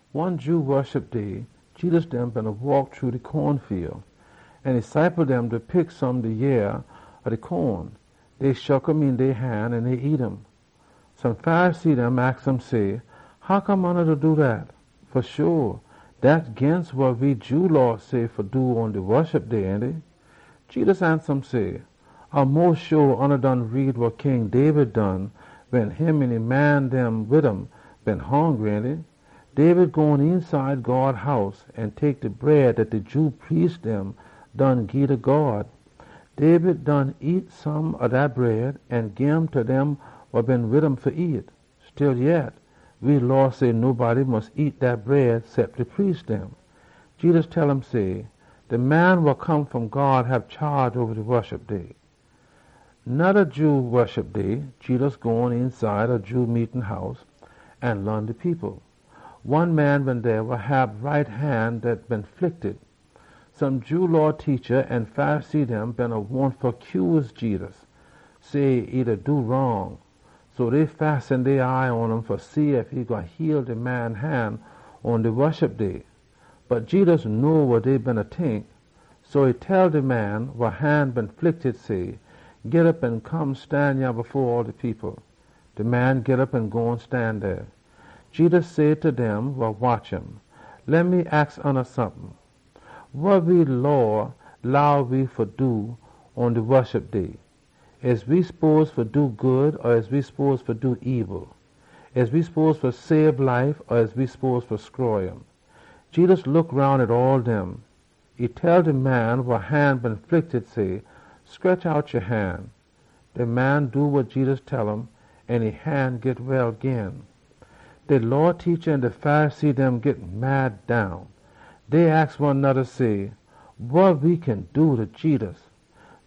One Jew Woshup Day, Jedus dem beena waak shru de wheat fiel, an e ciple dem pick some de yea ob de wheat. Dey shook um een dey han an nyam um. Some Pharisee dem aks um say, “Hoccome oona da do dat? Fa sho, dat ginst wa we Jew Law say fa do pon de Woshup Day, ainty?” Jedus ansa um say, “A mos sho oona done read wa King David done wen e an e man dem been hongry, ainty? David gone eenside God House, an e tek de bread dat de Jew priest dem done gii ta God. David nyam some ob dat bread an gim ta dem wa been wid um fa nyam. Stillyet, we Law say nobody mus nyam dat bread cep de priest dem.” Jedus tell um say, “De Man wa Come fom God hab chaage oba de Woshup Day.” Noda Jew Woshup Day, Jedus gone eenside de Jew meetin house an laan de people. One man been dey wa hab right han dat been flicted. Some Jew Law teacha an Pharisee dem been wahn fa cuse Jedus, say e da do wrong. So dey fasten dey eye pon um fa see ef e gwine heal de man han pon de Woshup Day. Bot Jedus know wa dey beena tink, so e tell de man wa han been flicted say, “Git op an come stan yah fo all de people.” De man git op an gone stan dey. Jedus say ta dem wa watch um, “Leh me aks oona sompin. Wa we Law leh we do pon we Woshup Day? We spose fa do good, or we spose fa do ebil? We spose fa sabe life or we spose fa stroy um?” Jedus look roun pon all dem. E tell de man wa han been flicted say, “Scretch out ya han!” De man do wa Jedus tell um, an e han git well gin. De Law teacha an de Pharisee dem been mad down. Dey aks one noda say, “Wa we kin do ta Jedus?”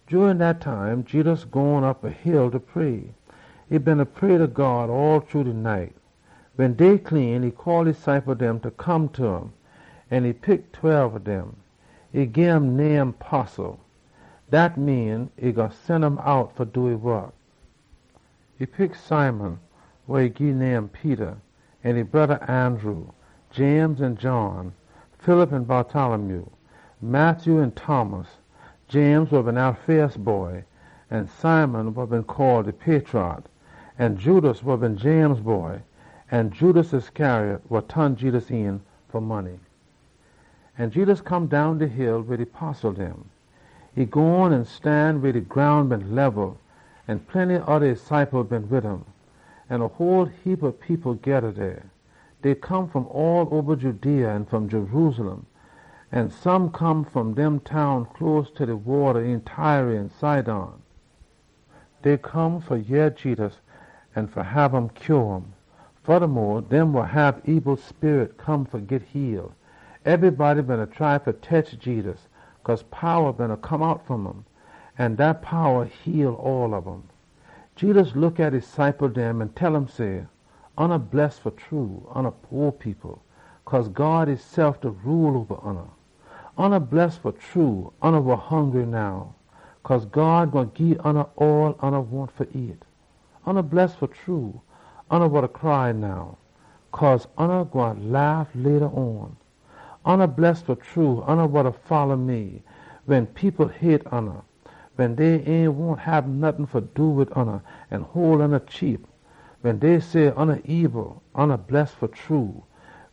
Jurin dat time Jedus gone op a hill fa pray. E beena pray ta God all shru de night. Wen day clean, e call e ciple dem fa come ta um, an e pick tweb dem. E gim name postle, dat mean e gwine sen um out fa do e wok. E pick Simon, wa e gii name Peter, an e broda Andrew, James an John, Philip an Bartholomew, Matthew an Thomas, James wa been Alphaeus boy, an Simon wa been call de Patrot, an Judas wa been James boy, an Judas Iscariot, wa ton Jedus een fa money. An Jedus come down de hill wid e postle dem. E gone an stan weh de groun been lebel, an plenty oda e ciple dem been wid um. An a whole heapa people geda dey. Dey come fom all oba Judea an fom Jerusalem, an some come fom dem town close ta de sho een Tyre an Sidon. Dey come fa yeh Jedus an fa hab um heal um. Fodamo, dem wa hab ebil sperit come an git heal. Ebrybody beena try fa tetch Jedus, cause powa beena come out fom um. An dat powa heal all ob um. Jedus look at e ciple dem an tell um say, “Oona bless fa true, oona po people, cause God da rule oba oona. Oona bless fa true, oona wa hongry now, cause God gwine gii oona all oona wahn fa nyam. Oona bless fa true, oona wa da cry now, cause oona gwine laugh later on. Oona bless fa true, wen people hate oona, wen dey ain wahn hab nottin fa do wid oona an hole oona cheap, wen dey say oona ebil. Oona bless fa true,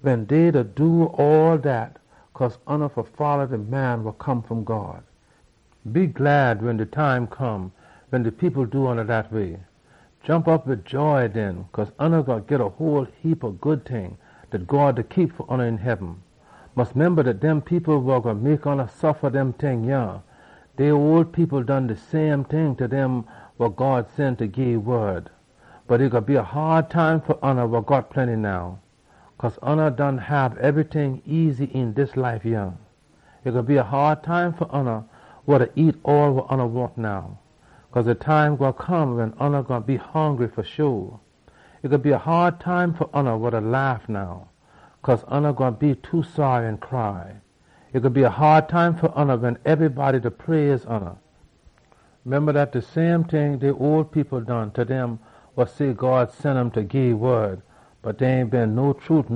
wen dey do all dat cause oona da folla de Man wa Come fom God. “Mus be heppy wen de time come wen de people do oona dat way. Jomp op wid joy den, cause oona gwine git a whole heapa good ting dat God da keep fa oona een heaben. Mus memba dat de people wa gwine mek oona suffa dem ting yah, dey ole people done done de same ting ta dem wa God been sen fa gii e wod. “Bot e gwine be a haad time fa oona wa got plenty now, cause oona done hab ebryting easy een dis life yah. E gwine be a haad time fa oona wa da nyam all wa oona wahn now, cause de time gwine come wen oona gwine be hongry. E gwine be a haad time fa oona wa da laugh now, cause oona gwine be too saary an cry. E gwine be a haad time fa oona wen ebrybody da praise oona. Dat de same ting oona ole people done done ta dem wa say dey God prophet bot dey ain been fa true.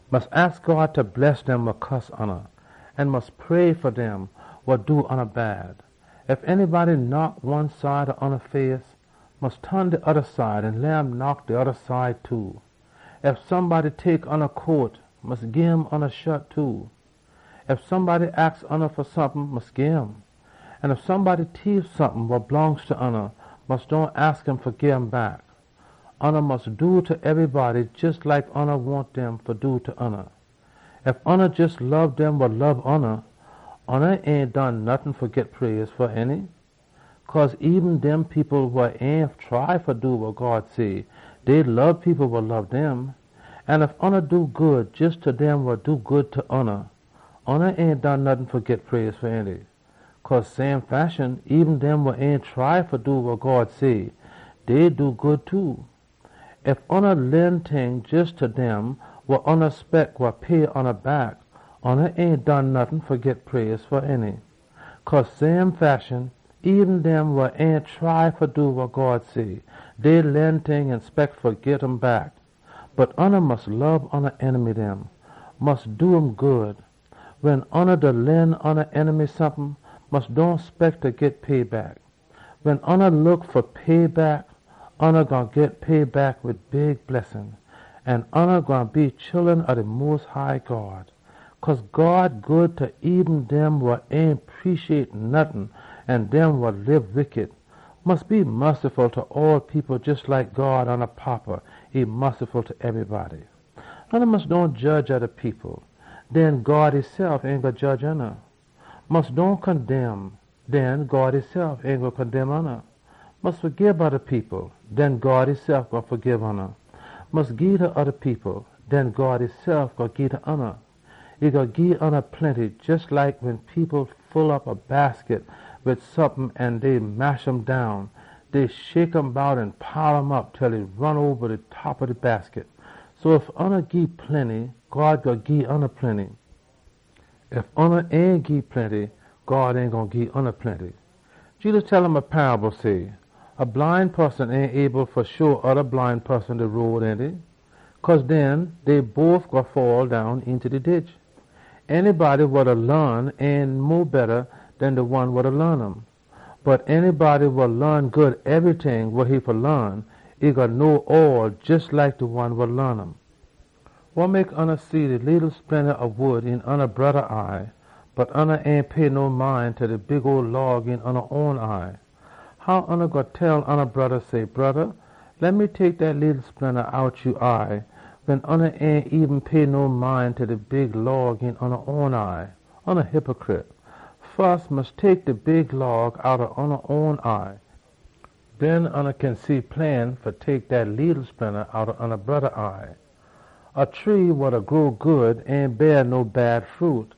Mus aks God fa bless dem wa cuss ya, an mus pray fa dem wa do ya bad. Ef anybody knock one side ob ya face, mus ton de oda side an leh um knock dat side too. Ef somebody tek ya coat, mus gim ya shat too. Ef somebody aks ya fa sompin, mus gim. An ef somebody tief sompin wa blongst ta ya, mus dohn aks um fa gim back. Oona mus do ta ebrybody jes like oona wahn dem fa do ta oona. “Ef ya jes lob dem wa lob ya, ya ain done nottin fa git praise fa, ainty? Cause eben dem people wa ain try fa do wa God say, dey lob people wa lob dem! An ef ya do good jes ta dem wa do good ta ya, ya ain done nottin fa git praise fa, ainty? Cause same fashion, eben dem wa ain try fa do wa God say, dey da do dat too! Ef ya lend ting jes ta dem wa ya spect gwine pay ya back, ya ain done nottin fa git praise fa, ainty? Cause same fashion, eben dem wa ain try fa do wa God say, dey lend ting an spect fa git um back! Bot ya mus lob ya enemy dem. Mus do um good. Wen ya da lend ya enemy sompin, mus dohn spect fa git payback. Wen ya ain look fa payback, ya gwine git payback wid big blessin, an ya gwine be chullun ob de Mos High God. Cause God good ta eben dem wa ain preciate nottin, an dem wa lib wickity. Mus hab mussy pon all people jes like God, oona Fada, e hab mussy pon ebrybody. “Oona mus dohn jedge oda people. Den God esef ain gwine jedge oona. Mus dohn condemn. Den God esef ain gwine condemn oona. Mus fagib oda people. Den God esef gwine fagib oona. Mus gii ta oda people. Den God esef gwine gii ta oona. E gwine gii ya plenty, jes like wen people full op a basket wid sompin an dey mash um down. Dey shake um bout an pile um op til e ron oba de top ob de basket. So ef ya gii plenty, God gwine gii ya plenty. Ef ya ain gii plenty, God ain gwine gii ya plenty.” Jedus tell um a paable say, “A bline poson ain able fa sho oda bline poson de road, ainty? Cause den, dey all two gwine faddown eenta de ditch. Anybody wa da laan ain mo betta den de one wa da laan um. Bot anybody wa laan good ebryting wa e fa laan, e gwine know all, jes like de one wa laan um. “Wa mek ya see de leetle splinta ob wood een ya broda eye, bot ya ain pay no mind ta de big log een ya own eye. How ya gwine tell ya broda say, ‘Broda, leh me tek dat leetle splinta out ya eye,’ wen ya ain eben pay no mind ta de big log een ya own eye? Oona hypicrit! Fus mus tek de big log outta ya own eye. Den ya kin see plain fa tek dat leetle splinta outta ya broda eye. “A tree wa da grow good ain beah no bad fruit,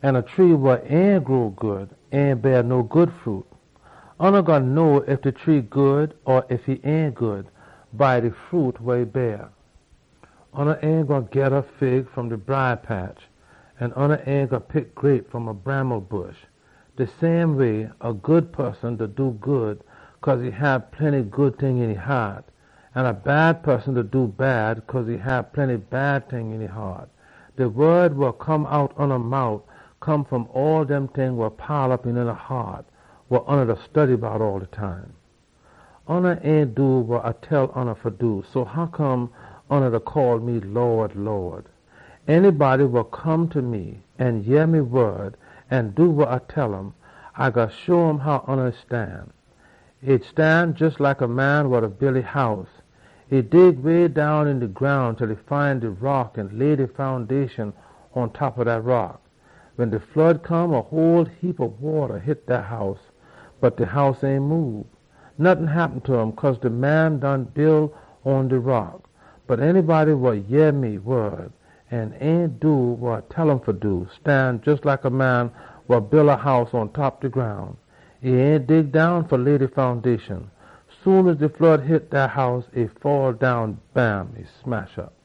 an a tree wa ain da grow good ain beah no good fruit. Oona gwine know ef de tree good or bad by de fruit wa e da beah. Oona ain gwine geda fig fom de briah patch, an oona ain gwine pick grape fom a bramble bush. De same way so, a good poson da do good cause e hab plenty good ting een e haat, an a bad poson da do bad cause e hab plenty bad ting een e haat. De wod wa come out oona mout come fom all dem ting wa pile op een oona haat, wa oona da study bout all de time. “Oona ain do wa A tell oona fa do, so hoccome oona da call me, ‘Lawd, Lawd’? Anybody wa come ta me an yeh me wod an do wa A tell um, A gwine show oona how e stan. E stan jes like a man wa da build a house. E dig way down een de groun til e find de rock an lay de foundation pontop ob dat rock. Wen de flood come, a whole heapa wata hit dat house, bot de house ain moob. Nottin happen ta um, cause de man done build um pon de rock. Bot anybody wa yeh me wod an ain do wa A tell um fa do, stan jes like a man wa build e house pontop ob de groun. E ain dig down fa lay de foundation. Soon as de flood hit dat house, e faddown. Bam! E smash op!”